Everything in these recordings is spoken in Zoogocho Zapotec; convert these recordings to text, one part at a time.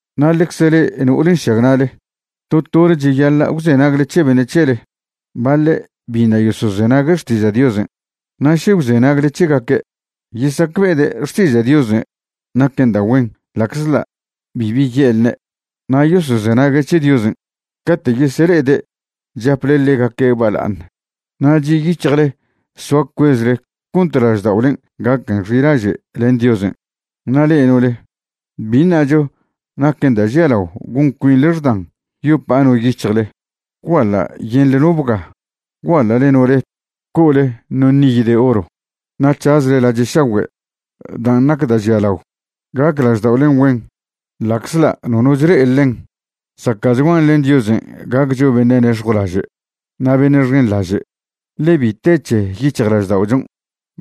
Na' ḻecze le'e no'ole nšagna'le, to tole cheyaḻa' gwzenagle c̱he beṉe' c̱hele. Baḻe' biṉa' yosozenague' xtiža' Diosen', na' še gwzenagle c̱hegaque', yesacbe'ede' xtiža' Diosen' naquen da' güen ḻa'czḻa' bibi ye'lne'. Na' yosozenague' c̱he Diosen' cate' yesele'ede' chaple ḻegaque' bala'aṉ na' chi' yic̱hjle soa cuezle cont lažda'olen' gaquen xilaže' len Diosen'. Na' le'e no'ole, bi ṉacho naquen da' žialao gon cuinḻe xdan yopa'a no yic̱hjle, gwguaḻa' yenḻe no bga', gwguaḻa'le no ret, co'ole no niy de oro, na' c̱hazle lache' šagüe'. Dan' nac da' žialao, gac lažda'olen' güen, ḻa'czḻa' nono chle'e ḻen. Zaca'chguan len Diosen' gaccho beṉe' nex̱jwlaže' na' beṉe' xenḻaže', ḻe bi te c̱he yic̱hjlažda'ochon'.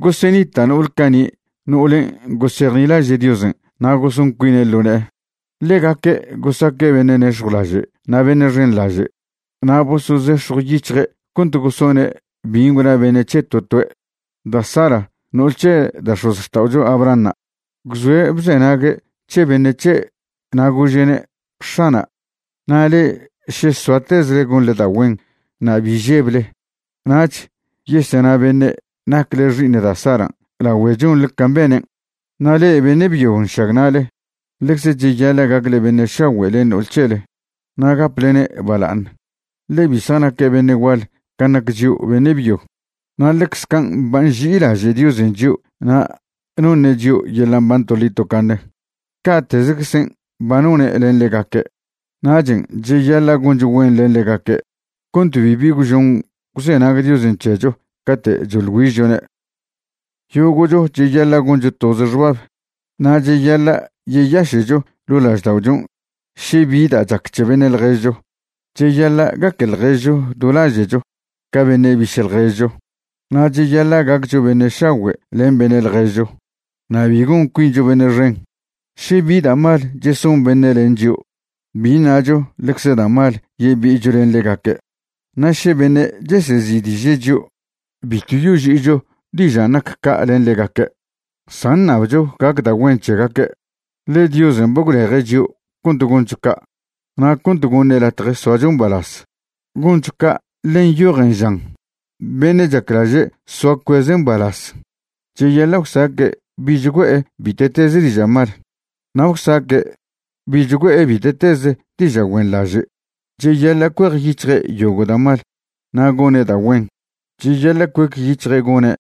Gosenita' no'ole cani' no'olen' gosejnilaže' Diosen' na' goson cuine' ḻo ne'e. Ḻegaque' gosaque' beṉe' nex̱jwlaže' na' beṉe' xenḻaže' na' bosozex̱jwyic̱hje' cont gosone' bin' gwna beṉe' c̱he to toe'. Da' Sara, no'ol c̱he da' x̱ozxta'oto' Abrahanṉa', gwzoe' bzenague' c̱he beṉe' c̱he' na' gože'ne': “X̱ana'”. Na' le'e še soatezle gonḻe da' güen na' bi žeble, nach yesena beṉe' nacle xi'iṉ da' Saran' lagüe chonḻe can' benen'. Na' le'e beṉe' byo nšagna'le, ḻecze cheyaḻa' gacle beṉe' šagüe' len no'ol c̱hele na' gaplene' bala'aṉ, ḻe bi zjanaque' beṉe' gual can' nac chio' beṉe' byo. Na' ḻecze can' ba nži'ilaže' Diosen' chio' na' noṉe' chio' yeḻa' mban toḻi tocaṉe, ca'tezeczen' ba none' len ḻegaque'. Nachen' cheyaḻa' goncho güen len ḻegaque' cont bibi gwžon gwzenag Diosen' c̱hecho cate' choḻ güižchone'. Yogo'cho cheyaḻa' goncho toze xbab na' cheyaḻa' yeyaše'cho ḻo' lažda'ochon' še bi da' chac c̱he beṉe' ḻježcho. Cheyaḻa' gaque ḻježcho do laže'cho ca beṉe' biše' ḻjezcho, na' cheyaḻa' gaccho beṉe' šagüe' len beṉe' ḻježcho na' bi gon cuincho beṉe' xen. Še bi da' mal cheson beṉe' len chio', bi ṉacho ḻecze da' mal yebi'icho len ḻegaque'. Na' še beṉe' chesezi'diže' chio', bitw yoži'icho dižan' nac ca' len ḻegaque', san ṉabcho gac da' güen c̱hegaque'. Ḻe Diosen' ba gwleje' chio' cont goncho ca' na' cont goṉe' latje soacho mbalaz. Goncho ca' ḻe nyojen, žan: Beṉe' chaclaže' soa cueze' mbalaz, cheyaḻa' gwsaque' bich güe'e bite'teze diža' mal, na' gwsaque' bich güe'e bite'teze diža' güenḻaže'. Cheyaḻa' cuejyic̱hje' yogo' da' mal na' gone' da' güen. Cheyaḻa' cuec yic̱hje' gone'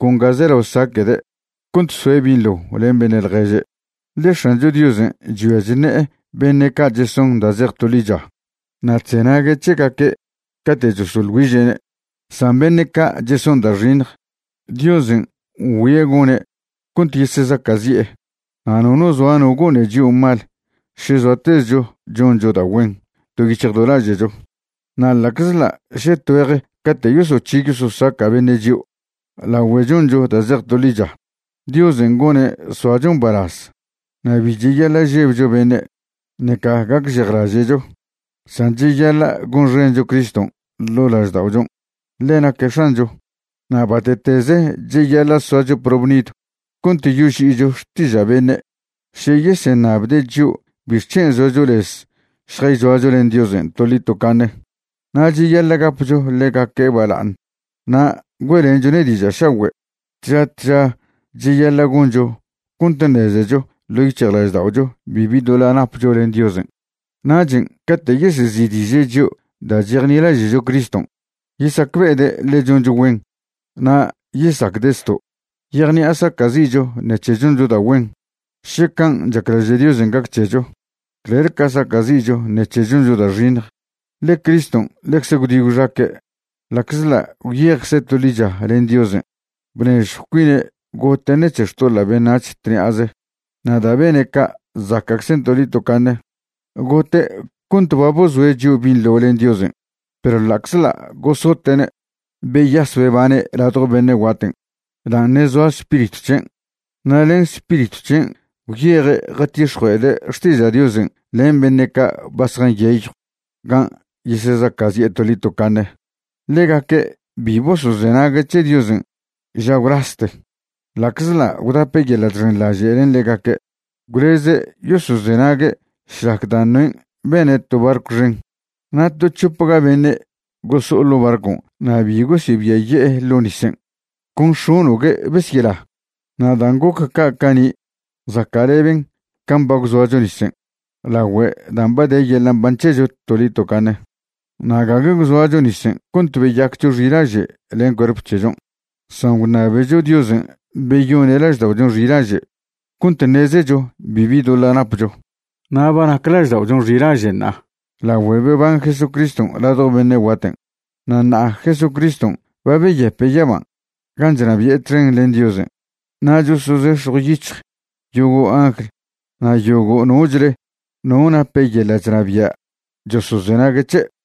con ga zelao saque'de' cont soe' binḻo len beṉe' ḻježe'. Ḻe X̱ancho Diosen' chgüia chṉe'e beṉe' ca' cheson da' zej to ḻicha, na' chzenague' c̱hegaque' cate' chosoḻ güiže'ne'. San beṉe' ca' cheson da' xiṉj, Diosen' ngüie' gone' cont yesezaca'zi'e. Na' nono zoa no gone chio' mal še zoatezcho choncho da' güen do yic̱hj do laže'cho. Na' ḻa'czḻa' še tgüej cate' yosoc̱hi yososaca' beṉe' chio' lagüe choncho da' zej to ḻicha, Diosen' gone' soacho mbalaz. Na' bi cheyaḻa' žebcho beṉe', ṉeca gacžejlaže'cho. San cheyaḻa' gonxencho Criston' ḻo' lažda'ochon', ḻe naque' X̱ancho. Na' bate'teze cheyaḻa' soacho probnidw cont yoži'icho xtiža' beṉe' še yeseṉabde' chio' bixc̱hen' zoacho lez šjayzoacho len Diosen' toḻi tocaṉe. Na' cheyaḻa' gapcho ḻegaque' bala'aṉ na' güe'lenchone' diža' šagüe'. Tža tža cheyaḻa' goncho cont ṉezecho ḻo' yic̱hjlažda'ocho bibi doḻa' napcho len Diosen'; nachen' cate' yesezi'diže' chio' da' chejnilaže'cho Criston', yesacbe'ede' ḻe choncho güen na' yesacde' zto'. Yejṉi'a saca'zi'cho ṉec̱he choncho da' güen, še can' chaclaže' Diosen' gac c̱hecho, clel ca saca'zi'cho ṉec̱he choncho da' xiṉj. Ḻe Criston' ḻecze gwdi gwxaque'. Ḻa'czḻa' gwyejcze' to ḻicha len Diosen', bnežjw cuine' gote' ṉec̱he xtoḻa' beṉac̱h tṉi'aze, na' da' bene' ca' zaca'czen' toḻi tocaṉe. Gote' cont ba bozoe' chio' binḻo len Diosen'. Perw ḻa'czḻa' gosote'ne', beyas bebane' ladjo beṉe' guaten', dan' ṉe' zoa spiritw c̱hen'. Na' len Spiritw c̱hen' gwyeje' jatix̱jue'ede' xtiža' Diosen' len beṉe' ca' ba zjanyeyw gan' yesezaca'zi'e toḻi tocaṉe. Ḻegaque' bi bosozenague' c̱he Diosen' ža gwlaste, ḻa'czḻa' gwdape' yeḻa' chxenḻaže' len ḻegaque', gwleze' yosozenague' šlac da' Noén' bene' to barcw xen. Na' to c̱hopga beṉe' goso'o ḻo' barcon' na' bi gosebiaye'e ḻo' nisen', con x̱ono'gue' besyela. Na' dan' goc ca' cani' zaca'leben can' ba gwzoacho nisen' lagüe dan' ba de yeḻa' mban c̱hecho toḻi tocaṉe. Na' gague gwzoacho nisen' cont beyaccho xilaže' len cuerp c̱hechon', san gwṉabecho Diosen' beyone' lažda'ochon' xilaže' cont ṉezecho bibi doḻa' napcho. Na' ba nac lažda'ochon' xilaže' ṉa'a lagüe beban Jesucriston' ladjo beṉe' guaten'. Na' ṉa'a Jesucriston' ba beyepe' yaban' gan' chnabi'e txen len Diosen', na' chosozex̱jw yic̱hj yogo' angl na' yogo' nochle no nape yeḻa' chnabia' chosozenague' c̱he'.